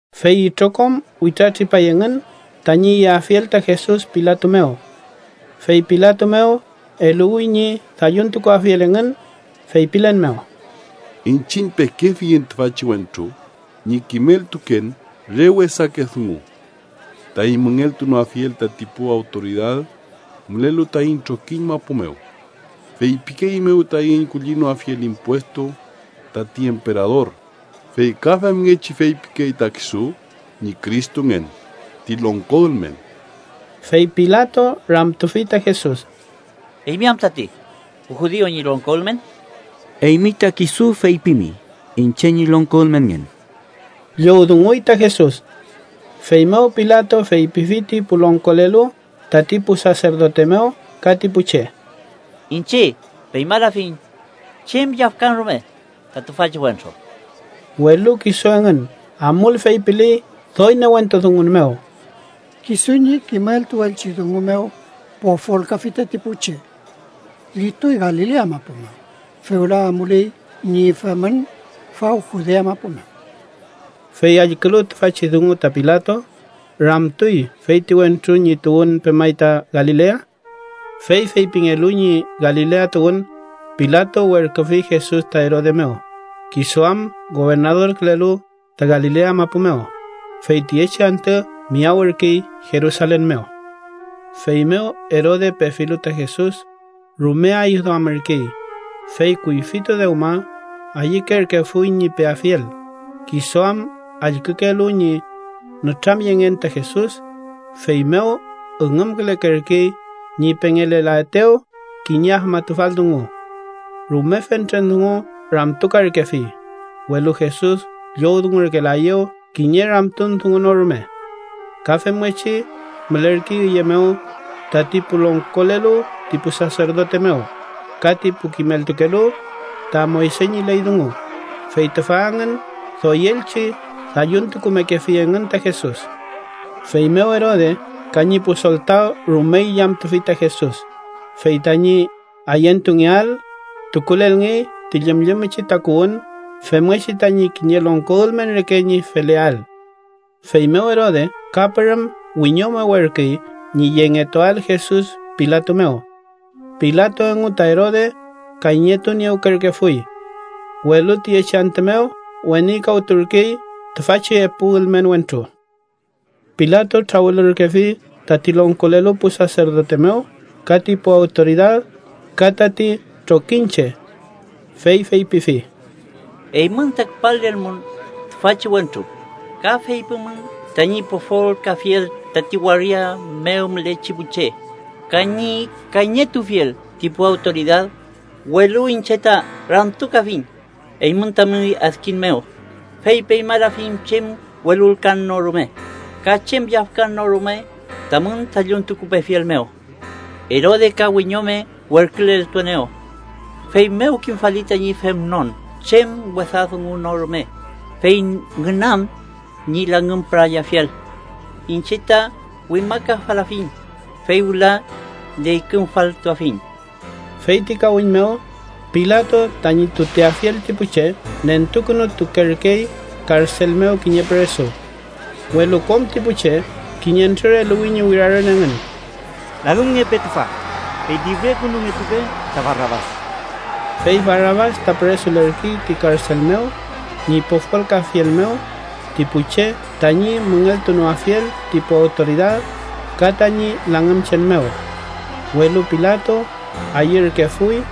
Fey itrokom witratripay engün tañi yeafiel ta Jesus Pilato mew. Fey Pilato mew eluwi ñi dalluntukuafiel engün, feypilen mew: —Iñchiñ pekefiyiñ tüfachi wentru ñi kimeltuken re wesake dungu taiñ müngeltunoafiel tati pu awtoridad mülelu taiñ trokiñ mapu mew. Feypikeeiñmew taiñ kullinoafiel impuestu tati emperador, fey ka femngechi feypikey ta kisu ñi Cristongen, ti longko ülmen. Fey Pilato ramtufi ta Jesus: —¿Eymi am tati pu judiu ñi longko ülmen? —Eymi ta kisu feypimi iñche ñi longko ülmenngen ―llowdunguy ta Jesus. Feymew Pilato feypifi ti pu longkolelu tati pu saserdote mew ka ti pu che: —Iñche peñmalafiñ chem yafkan rume ta tüfachi wentru. Welu kisu engün amul feypiley doy newentu dungun mew: —Kisu ñi kimeltuelchi dungu mew pofolkafi tati pu che. Llituy Galilea mapu mew, fewla amuley ñi femün faw Judea mapu mew. Fey allkülu tüfachi dungu ta Pilato, ramtuy feyti wentru ñi tuwün pemay ta Galilea. Fey feypingelu ñi Galilea tuwün, Pilato werküfi Jesus ta Erode mew, kisu am gobernadorkülelu ta Galilea mapu mew, fey tiyechi antü miyawürkey Jerusalen mew. Feymew Erode pefilu ta Jesus, rume ayüwduamürkey, fey kuyfitu dewma ayükerkefuy ñi peafiel, kisu am allkükelu ñi nütramyengen ta Jesus, feymew üngümkülekerkey ñi pengelelaetew kiñe afmatufal dungu. Rume fentren dungu ramtukarkefi, welu Jesus llowdungurkelaeyew kiñe ramtun dungu no rume. Ka femngechi mülerkey üye mew tati pu longkolelu ti pu saserdote mew, ka ti pu kimeltukelu ta Moyse ñi ley dungu, fey tüfa engün doyelchi dalluntukumekefi engün ta Jesus. Feymew Erode ka ñi pu soltaw rume illamtufi ta Jesus, fey tañi ayentungeael tukulelngey ti llümllümchi takuwün femngechi tañi kiñe longko ülmen reke ñi feleael. Feymew Erode ka pürüm wiñome werküy ñi yengetuael Jesus Pilato mew. Pilato engu ta Erode kayñetuniewkerkefuy, welu tüyechi antü mew wenikawturkey tüfachi epu ülmen wentru. Pilato trawülürkefi tati longkolelu pu saserdote mew ka ti pu awtoridad ka tati trokiñche. Fey feypifi: —Eymün ta küpalelmun tüfachi wentru, ka feypimun tañi pofolkafiel tati waria mew mülechi pu che ka ñi kayñetuafiel ti pu awtoridad, welu iñche ta ramtukafiñ eymün tamün adkiñ mew, fey peñmalafiñ chem welulkan rume ka chem yafkan no rume tamün dalluntukupefiel mew. Erode ka wiñome werküleltuenew. Feymew kimfali tañi femnon chem wesa dungu no rume fey ngünam ñi langümpürayafiel. Iñche ta wimakafalafiñ, fey wüla neykümfaltuafiñ. Fey ti kawiñ mew, Pilato tañi tuteafiel ti pu che nentukünutukerkey karsel mew kiñe püresu. Welu kom ti pu che kiñentrür eluwi ñi wirarün engün: —¡Langümngepe tüfa! ¡Fey lifrekünutungepe ta Barabas! Fey Barabas ta püresulerkey ti karsel mew ñi pofolkafiel mew ti pu che tañi müngeltunoafiel ti pu awtoridad, ka tañi langümchen mew. Welu Pilato ayürkefuy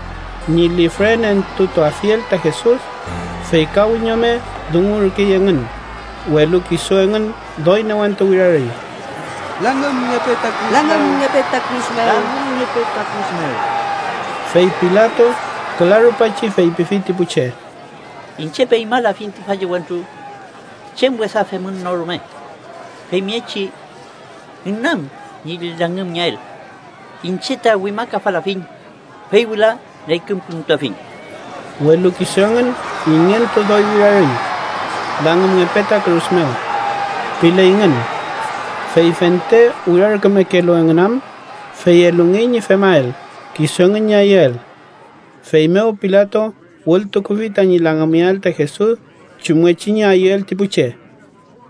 ñi lifrenentutuafiel ta Jesus, fey ka wiñome dungungerkey engün, welu kisu engün doy newentu wirarüy: —¡Langümngepe ta kürus mew! ¡Langümngepe ta kürus mew! Fey Pilato küla rupachi feypifi ti pu che: —Iñche peñmalafiñ tüfachi wentru chem wesa femün no rume, femngechi ngünam ñi langümngeael. Iñche ta wimakafalafiñ, fey wüla neykümkünutuafiñ. Welu kisu engün ingentu doy wirarüy, “langümngepe ta kürus mew” pileyngün. Fey fente wirarkümekelu engün am, fey elungey ñi femael kisu engün ñi ayüel. Feymew Pilato wültukufi tañi langümngeael ta Jesus chumngechi ñi ayüel ti pu che.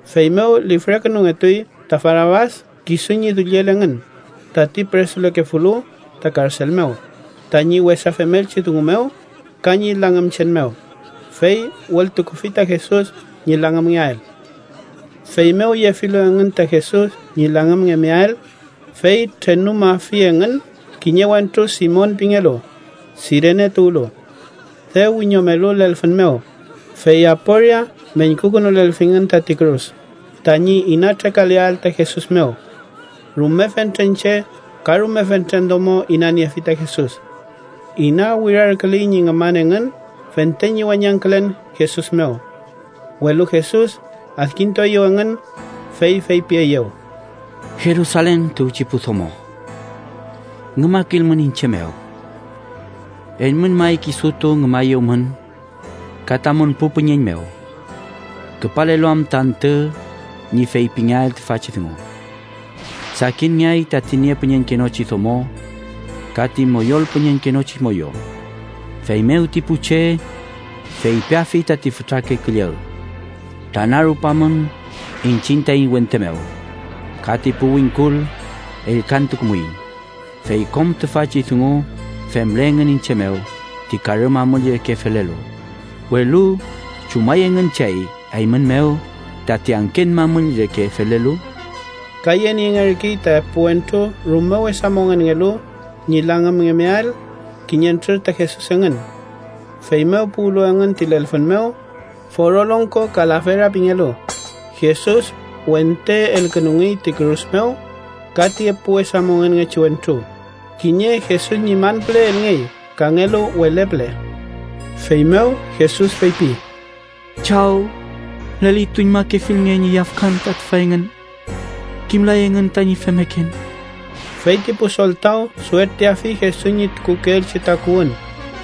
Feymew lifrekünungetuy ta Barabas kisu ñi dulliel engün, tati püresulekefulu ta karsel mew tañi wesa femelchi dungu mew ka ñi langümchen mew, fey wültukufi ta Jesus ñi langümngeael. Feymew yefilu engün ta Jesus ñi langümngemeael, fey trenumafi engün kiñe wentru Simon pingelu, Sirene tuwlu. Dew wiñomelu lelfün mew, fey aporia meñkukünulelfingün tati kürus tañi ina trekaleael ta Jesus mew. Rume fentren che ka rume fentren domo inaniefi ta Jesus. Ina wirarküley ñi ngüman engün fente ñi weñangkülen Jesus mew. Welu Jesus adkintueyew engün, fey feypieyew: —Jerusalen tuwchi pu domo, ngümakilmün iñche mew. Eymün may kisutu ngümayewmün ka tamün pu püñeñ mew, küpalelu am ta antü ñi feypingeael tüfachi dungu: ‘Sakinngeay tati niepüñeñkenochi domo ka ti moyolpüñeñkenochi moyo.’ Feymew ti pu che feypiafi tati fütrake külleg: ‘¡Tranarupamün iñchiñ taiñ wente mew!’ Ka ti pu wingkul: ‘¡Ellkantukumuiñ!’ Fey kom tüfachi dungu femle engün iñche mew ti karü mamüll reke felelu, welu ¿chumay engün chey eymün mew tati angken mamüll reke felelu? Ka yeniengerkey ta epu wentru rume wesa mongenngelu ñi langümngeael kiñentrür ta Jesus engün. Feymew puwlu engün ti lelfün mew, Foro Longko (Kalafera) pingelu, Jesus wente elkünungey ti kürus mew ka ti epu wesa mongenngechi wentru, kiñe Jesus ñi man püle elngey kangelu wele püle. Feymew Jesus feypi: “Chaw, lelituñmakefilnge ñi yafkan ta tüfa engün. Kimlay engün tañi femmeken.” Fey ti pu soltaw suertiafi Jesus ñi tukukeelchi takuwün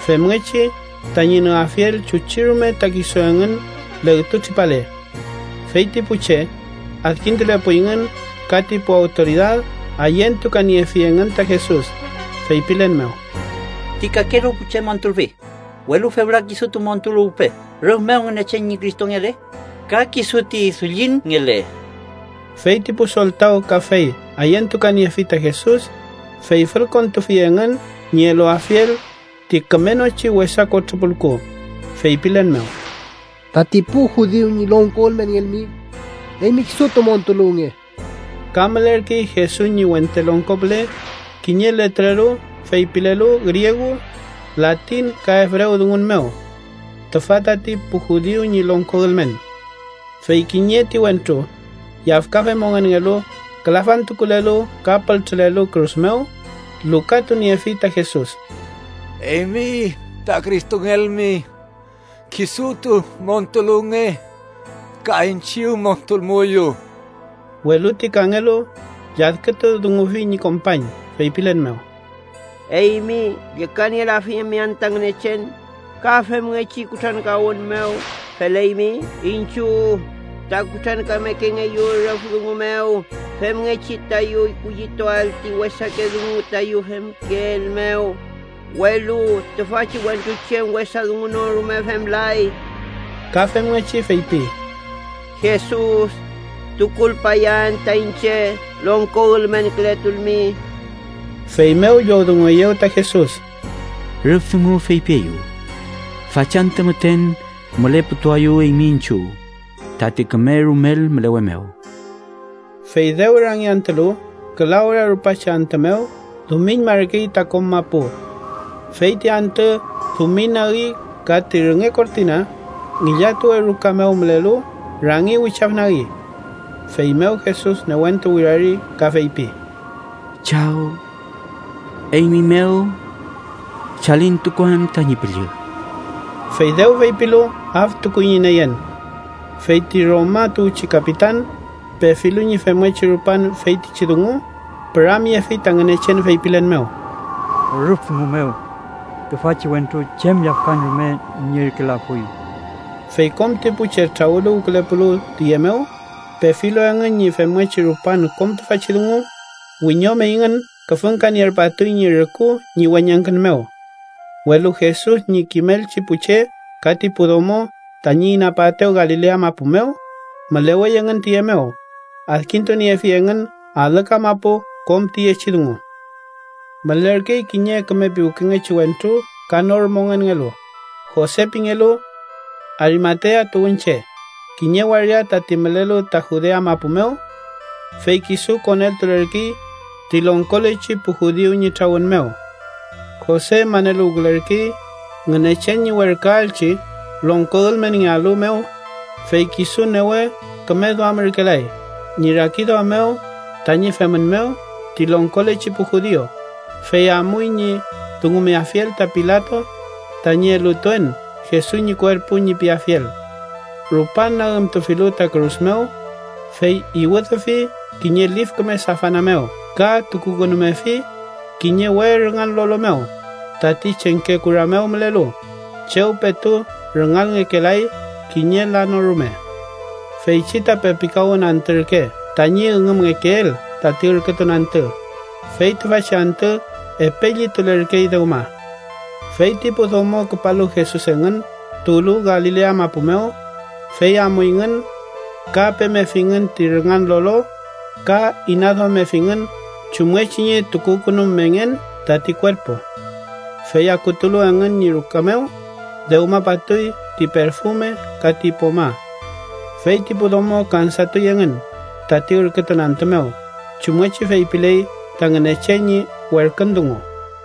femngechi tañi nüafiel chuchi rume ta kisu engün legtu tripale. Fey ti pu che adkintulepuyngün ka ti pu awtoridad ayentukaniefi engün ta Jesus, feypilen mew: —Ti kakelu pu che montulfi, welu fewla kisutu montuluwpe rüf mew Ngünechen ñi Cristongele ka kisu ti Dullinngele. Fey ti pu soltaw kafey ayentukaniefi ta Jesus, fey fülkontufi engün ñi eluafiel ti kümenochi wesa kotrü pulku, feypilen mew: —Tati pu judiu ñi longko ülmenngelmi, eymi kisutu montuluwnge. Ka mülerkey Jesus ñi wente longko püle kiñe letreru feypilelu griegu, latin ka ebrewdungun mew: TÜFA TATI PU JUDIU ÑI LONGKO ÜLMEN. Fey kiñe ti wentru, yafkafe mongenngelu külafantukulelu ka pültrülelu kürus mew, lukatuniefi ta Jesus: —Eymi ta Cristongelmi, kisutu montuluwnge ka iñchiw montulmuyu. Welu ti kangelu lladkütudungufi ñi kompañ, feypilen mew: —¿Eymi llükanielafimi anta Ngünechen? Ka femngechi kutrankawün mew feleymi. Iñchiw ta kutrankamekengeyu rüf dungu mew femngechi tayu kullituael ti wesake dungu tayu femkeel mew, welu tüfachi wentru chem wesa dungu no rume femlay. Ka femngechi feypi: —Jesus, tukulpayaen ta iñche, longko ülmenkületulmi. Feymew llowdungueyew ta Jesus: —Rüf dungu feypieyu. Fachantü müten müleputuayu eymi iñchiw tati küme rumel mülewe mew. Fey dew rangiantülu, küla ora rupachi antü mew dumiñmarkey ta kom mapu. Fey ti antü dumiñnagi ka ti rünge kortina ngillatuwe ruka mew mülelu rangi wichafnagi. Feymew Jesus newentu wirari ka feypi: —Chaw, eymi mew chalintukuan tañi püllü. Fey dew feypilu, aftukuy ñi neyen. Fey ti Roma tuwchi kapitan, pefilu ñi femngechi rupan feytichi dungu, püramyefi ta Ngünechen feypilen mew: —Rüf dungu mew tüfachi wentru chem yafkan rume nierkelafuy. Fey kom ti pu che trawüluwkülepulu tüye mew, pefilu engün ñi femngechi rupan kom tüfachi dungu, wiñomeyngün küfüngkanierpatuy ñi rüku ñi weñangkün mew. Welu Jesus ñi kimelchi pu che ka ti pu domo tañi inapaetew Galilea mapu mew, mülewey engün tüye mew, adkintuniefi engün alü kamapu kom tüyechi dungu. Mülerkey kiñe küme piwkengechi wentru ka nor mongenngelu, Jose pingelu. Arimatea tuwünche, kiñe waria tati mülelu ta Judea mapu mew. Fey kisu koneltulerkey ti longkolechi pu judiu ñi trawün mew. Jose maneluwkülerkey Ngünechen ñi werküaelchi longko ülmenngealu mew. Fey kisu newe küme duamürkelay ñi rakiduam mew tañi femün mew ti longkolechi pu judiu. Fey amuy ñi dungumeafiel ta Pilato tañi “elutuen Jesus ñi kuerpu” ñi piafiel. Rupan nagümtufilu ta kürus mew, fey iwüdüfi kiñe lif küme safana mew ka tukukünumefi kiñe we rüngan lolo mew, tati chengke kura mew mülelu, chew petu rüngalngekelay kiñe la no rume. Feychi ta pepikawün antü ürke tañi üngümngekeel tati ürkütun antü, fey tüfachi antü epe llitulerkey dewma. Fey ti pu domo küpalu Jesus engün tuwlu Galilea mapu mew, fey amuyngün ka pemefingün ti rüngan lolo ka inaduammefingün chumngechi ñi tukukünumengen tati kuerpu. Fey akutulu engün ñi ruka mew, dewmapatuy ti perfume ka ti poma. Fey ti pu domo kansatuy engün tati ürkütun antü mew, chumngechi feypiley ta Ngünechen ñi werkün dungu.